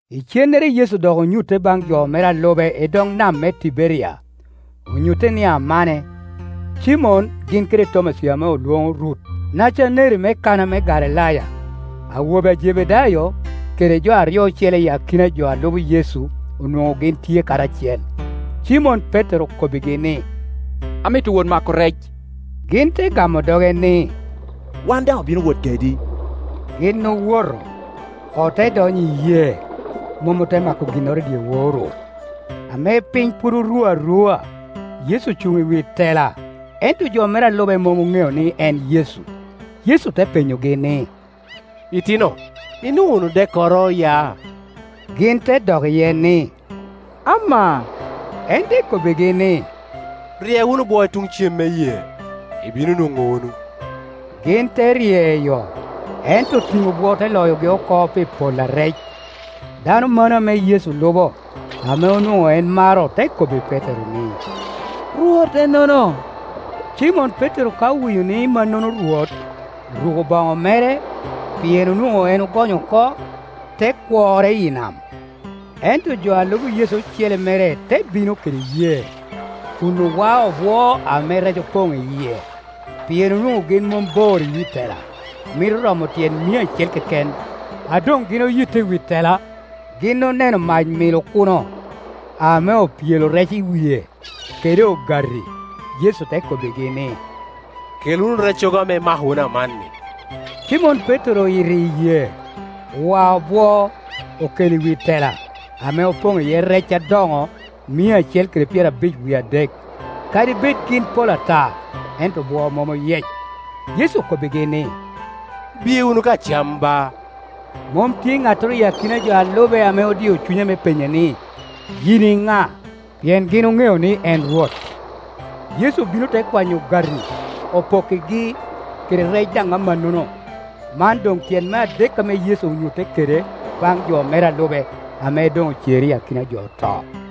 Icennere Yecu dok onyutte baŋ jo mere a lube i dog nam me Tiberia; onyutte ni amane. Cimon gin kede Tomaci ame olwoŋo Rut, Nacaneri me Kana me Galilaya, awobe a Jebedayo, kede jo aryo ocele i akina jo a lubo Yecu onwoŋo gin tye karacel. Cimon Petero okobbigi ni, “Amito wot mako rec.” Gin te gamo doge ni, “Wan daŋ obino wot kedi.” Gin owoto, ote donyo i yee, mom ote ma ko ginnoro i dyewor-ru. Ame piny pwod oru arua, Yecu ocuŋ i wi tela, ento jo mere a lube mom oŋeo ni en Yecu. Yecu te penyogi ni, “Itino, inwoŋo wunu dekkoro ya?” Gin te dok iye ni, “Amaa.” En te kobbigi ni, “Rye wunu bwo i tuŋ cem me yee, ibino nwoŋo wunu.” Gin te ryeyo, ento tiŋo bwo te loyogi oko pi pol a rec. Dano mano ame lubo Yecu, ame onwoŋo en maro te kobbi Petero ni, “Rwot ennono.” Cimon Petero ka owinyo ni mannono Rwot, oruko boŋo mere, pien onwoŋo en ogonyo oko, te kworre i nam. Ento jo a lubo Yecu ocele mere te bino kede yee, kun owao obwo ame rec opoŋ iye, pien onwoŋo gin mom bor i wi tela, mito romo tyen mia acel keken. A doŋ gin oyito i wi tela, gin oneno mac milo kuno, ame opyelo rec i wie, kede ogati. Yecu te kobbigi ni, “Kel wunu reccogo ame imako wunu amanni.” Cimon Petero oyito i yee, owao bwo, okelo i wi tela, ame opoŋ iye rec adoŋo, mia acel kede pyerabic wie adek. Kadi bed gin pol ata, ento bwo mom oyec. Yecu okobbigi ni, “Biye wunu ka cam, ba,” Mom tye ŋattoro i akina jo a lube ame odio cunye me penye ni, “Yin i ŋa?” Pien gin oŋeo ni en Rwot. Yecu obino te kwanyo ogati, opokkigi, kede rec daŋ amannono. Man doŋ tyen me adek ame Yecu onyutte kede bajj jo mere a lube, ame doŋ ocer i akina jo oto. “Kwa rommina”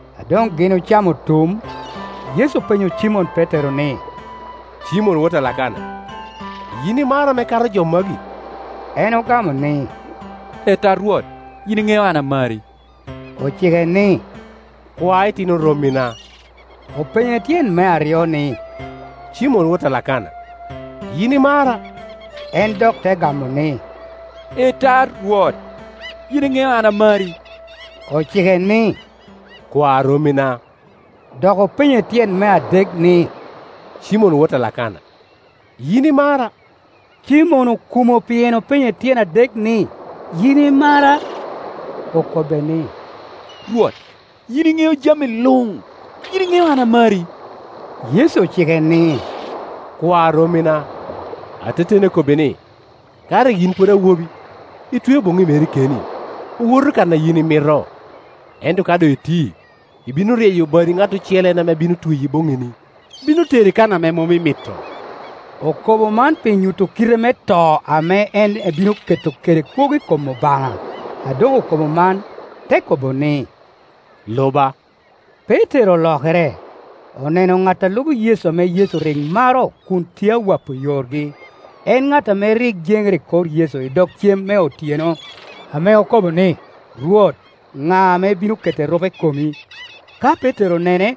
A doŋ gin ocamo otum, Yecu openyo Cimon Petero ni, “Cimon wot a Lakana, yin imara ame kato jo magi?” En ogamo ni, “Ee ta, Rwot, yin iŋeo an amari.” Ocike ni, “Kwa itino rommina.” Openye tyen me aryo ni, “Cimon wot a Lakana, yin imara?” En te dok gamo ni, “Ee ta, Rwot, yin iŋeo an amari.” Ocike ni, “Kwa rommina.” Dok openye tyen me adek ni, “Cimon wot a Lakana, yin imara?” Cimon okumo pien openye tyen adek ni, “Yin imara?” Okobbe ni, “Rwot, yin iŋeo jami luŋ; yin iŋeo an amari.” Yecu ocike ni, “Kwa rommina. Ateteni akobbi ni, ka rik yin pwod awobi, itweo boŋi meri keni, owoto kan a yin imito, ento ka doŋ iti, ibino ryeyo badi ŋat ocele en ame bino tweyi bonŋini, bino teri kan ame mom imito.” Okobo man pi nyuto kite me to ame en ebino keto kede kwogo i kom Obaŋa. A doŋ okobo man, te kobo ni, “Luba.” Petero olokere, oneno ŋat a lubo Yecu ame Yecu rik maro kun tye awapo yorgi, en ŋat ame rik jenere i kor Yecu i dog cem me otyeno, ame okobo ni, “Rwot, na ame bino keto irupe i komi?” Ka Petero onene,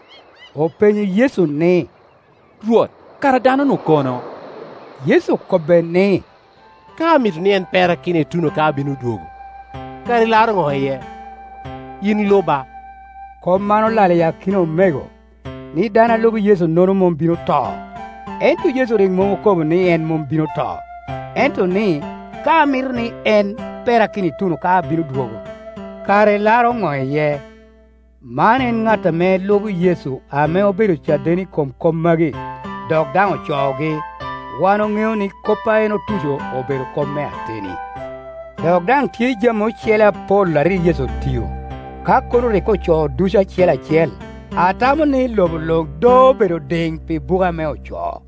openyo Yecu ni, “Rwot, kara dano-nu kono?” Yecu okobbe ni, “Ka amito ni en perakino ituno ka abino dwogo, kara ilaro ŋo iye? Yin luba.” Kop man olal i akina omego, ni dano a lubo Yecu-nono mom bino to: ento Yecu rik mom oko bo ni en mom bino to ento ni, “Ka amito ni en perakino ituno ka abino dwogo, kara ilaro ŋo iye?” Man en ŋat ame lubo Yecu ame obedo caden i kom kop magi, dok daŋ ocoogi; wan oŋeo ni kop a en otuco obedo kop me ateni. Dok daŋ tye jami ocele apol a rik Yecu otio; ka kono rik ocoo ducu acel acel, atamo ni lobo luŋ do obedo diŋ pi buke ame ocoo.